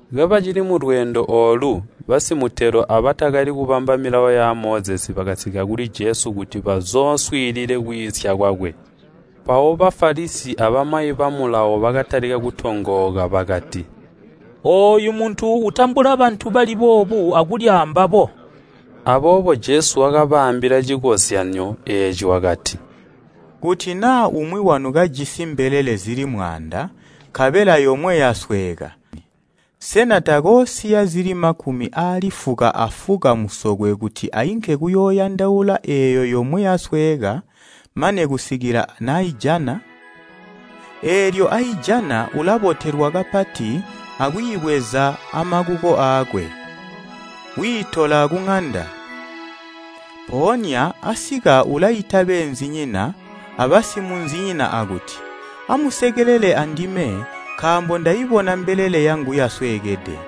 Kabacili mulweendo oolu basimutelo abatakali kubamba milawo ya Mozesi bakasika kuli Jesu kuti bazooswiilile kwiisya kwakwe. Mpawo Bafalisi abamayi ba Mulawo bakatalika kutongooka bakati, “Ooyu muntu utambula bantu bali boobu akulya ambabo.” Aboobo Jesu wakabaambila cikozyanyo eeci wakati, “Kuti naa umwi wanu kajisi mbelele zili mwaanda, nkabela yomwe yasweeka, sena takoosiya zili makumi aali fuka afuka musokwe kuti ainke kuyooyandaula eeyo yomwe yasweeka mane kusikila naijana? Eelyo aijana ulabotelwa kapati akwiibweza amakuko aakwe, wiitola kuŋanda. Mpoonya asika ulaita beenzinyina abasimunzinyina akuti, ‘Amusekelele andime, nkaambo ndaibona mbelele yangu yasweekede.’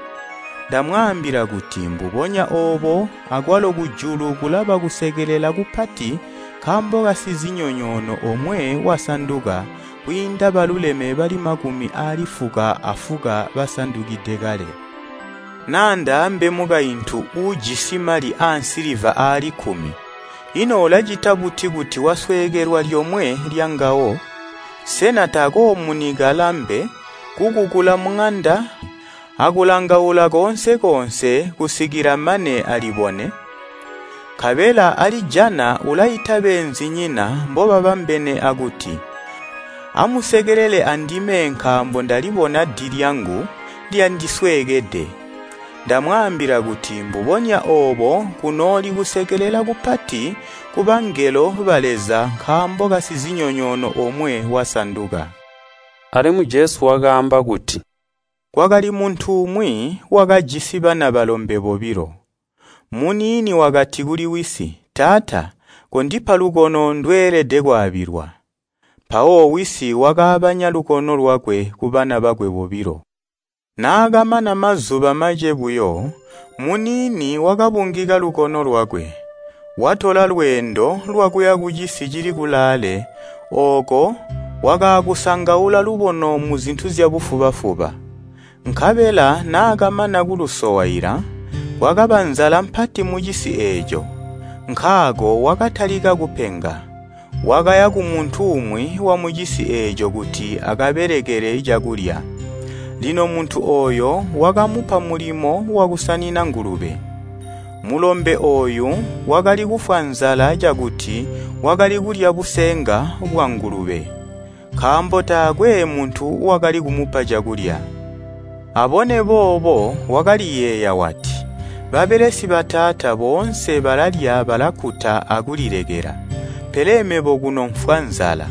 Ndamwaambila kuti mbubonya oobo akwalo kujulu kulaba kusekelela kupati nkaambo kasizinyonyoono omwe wasanduka, kwiinda baluleme bali makumi aali fuka afuka basandukide kale. “Naa ndaambe mukaintu uujisi mali aansiliva aali kkumi, ino ulacita buti kuti wasweekelwa lyomwe lyangawo? Sena takoomunika lambe, kukukula muŋanda, akulangaula koonse-koonse kusikila mane alibone? Nkabela alijana, ulaita beenzinyina mbobabambene akuti, ‘Amusekelele andime nkaambo ndalibona di lyangu lyandisweekede!’ Ndamwaambila kuti mbubonya oobo kunooli kusekelela kupati kubangelo ba Leza nkaambo kasizinyonyoono omwe wasanduka!” Alimwi Jesu wakaamba kuti, “Kwakali muntu umwi, wakajisi bana balombe bobilo. Muniini wakati kuli wisi, ‘Taata, kondipa lubono ndweelede kwaabilwa.’ Mpawo wisi wakaabanya lubono lwakwe kubana bakwe bobilo. Naakamana mazuba mace buyo, muniini wakabungika lubono lwakwe, watola lweendo lwakuya kucisi cili kulaale, ooko wakaakusangaula lubono muzintu zyabufuba-fuba. Nkabela naakamana kulusowaila, kwakaba nzala mpati mucisi eeco, nkaako wakatalika kupenga. Wakaya kumuntu umwi wamucisi eeco kuti akabelekele cakulya. Lino muntu ooyo wakamupa mulimo wakusanina ngulube. Mulombe ooyu wakali kufwa nzala cakuti wakali kulya busenga bwangulube, nkaambo taakwe muntu wakali kumupa cakulya. Abone boobo wakaliyeeya wati, ‘Babelesi bataata boonse balalya balakkuta akulilekela, pele mebo kuno mfwa nzala!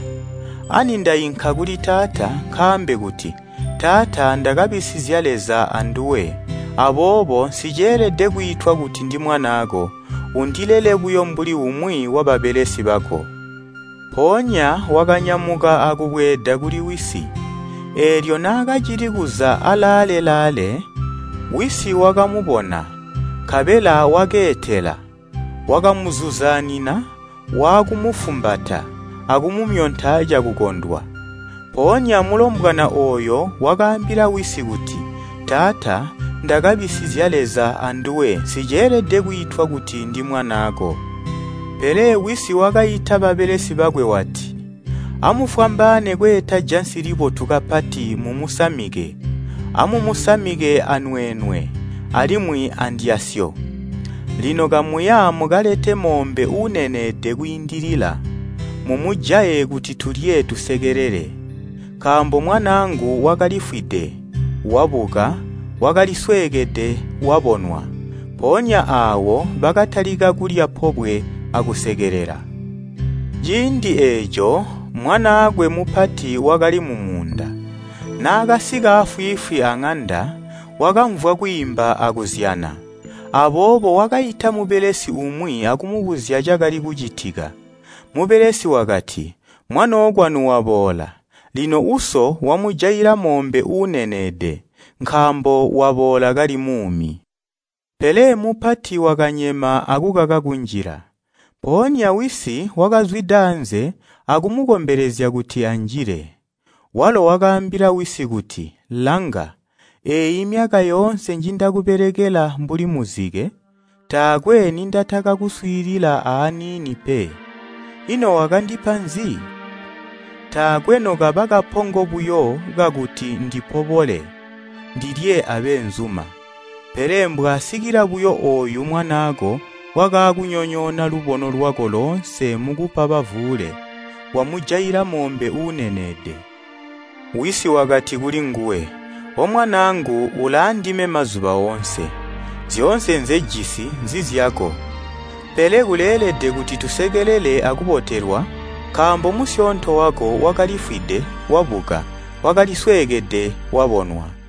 Ani, ndainka kuli taata, nkaambe kuti, “Taata, ndakabisizya Leza anduwe, aboobo nsiceelede kwiitwa kuti ndimwanaako, undilele buyo mbuli umwi wababelesi bako.” ’ Mpoonya wakanyamuka akubweeda kuli wisi. Eelyo naakacili kuza alaale-laale, wisi wakamubona, nkabela wakeetela, wakamuzuzaanina, waakumufumbata akumumyonta cakukondwa. Mpoonya mulombwana ooyo wakaambila wisi kuti, ‘Taata, ndakabisizya Leza anduwe, nsiceelede kwiitwa kuti ndimwanaako.’ Pele wisi wakaita babelesi bakwe wati, ‘Amufwambaane kweeta cakusama cibotu kapati, mumusamike. Mumusamike anweenwe, alimwi andyasyo. Lino kamuya mukalete moombe uuneneede kwiindilila, mumujaye kuti tulye tusekelele. Nkaambo mwanaangu wakalifwide, wabuka, wakalisweekede wabonwa.’ Mpoonya aawo bakatalika kulya pobwe akusekelela. “Ciindi eeco mwanaakwe mupati wakali mumuunda. Naakasika afwiifwi aŋanda, wakamvwa kwiimba akuzyana. Aboobo wakaita mubelesi umwi akumubuzya cakali kucitika. Mubelesi wakati, ‘Mwanookwanu waboola, lino uso wamujaila moobe uuneneede, nkaambo waboola kali muumi.’ Pele mupati wakanyema akukaka kunjila. Mpoonya wisi wakazwida aanze akumukombelezya kuti anjile. Walo wakaambila wisi kuti, ‘Langa! Eeyi myaka yoonse njindakubelekela mbuli muzike, taakwe nindatakakuswiilila aaniini pe. Ino wakandipa nzi? Taakwe nokaba kapongo buyo kakuti ndipobole, ndilye abeenzuma! Pele mbwaasikila buyo ooyu mwanaako wakaakunyonyoona lubono lwako loonse mukupa bavuule, wamujaila moombe uuneneede.’ Wisi wakati kulinguwe, ‘O Mwanaangu ulaandime mazuba oonse, zyoonse nzejisi nzizyako. Pele kuleelede kuti tusekelele akubotelwa, nkaambo musyoonto wako wakalifwide, wabuka, wakalisweekede, wabonwa.’”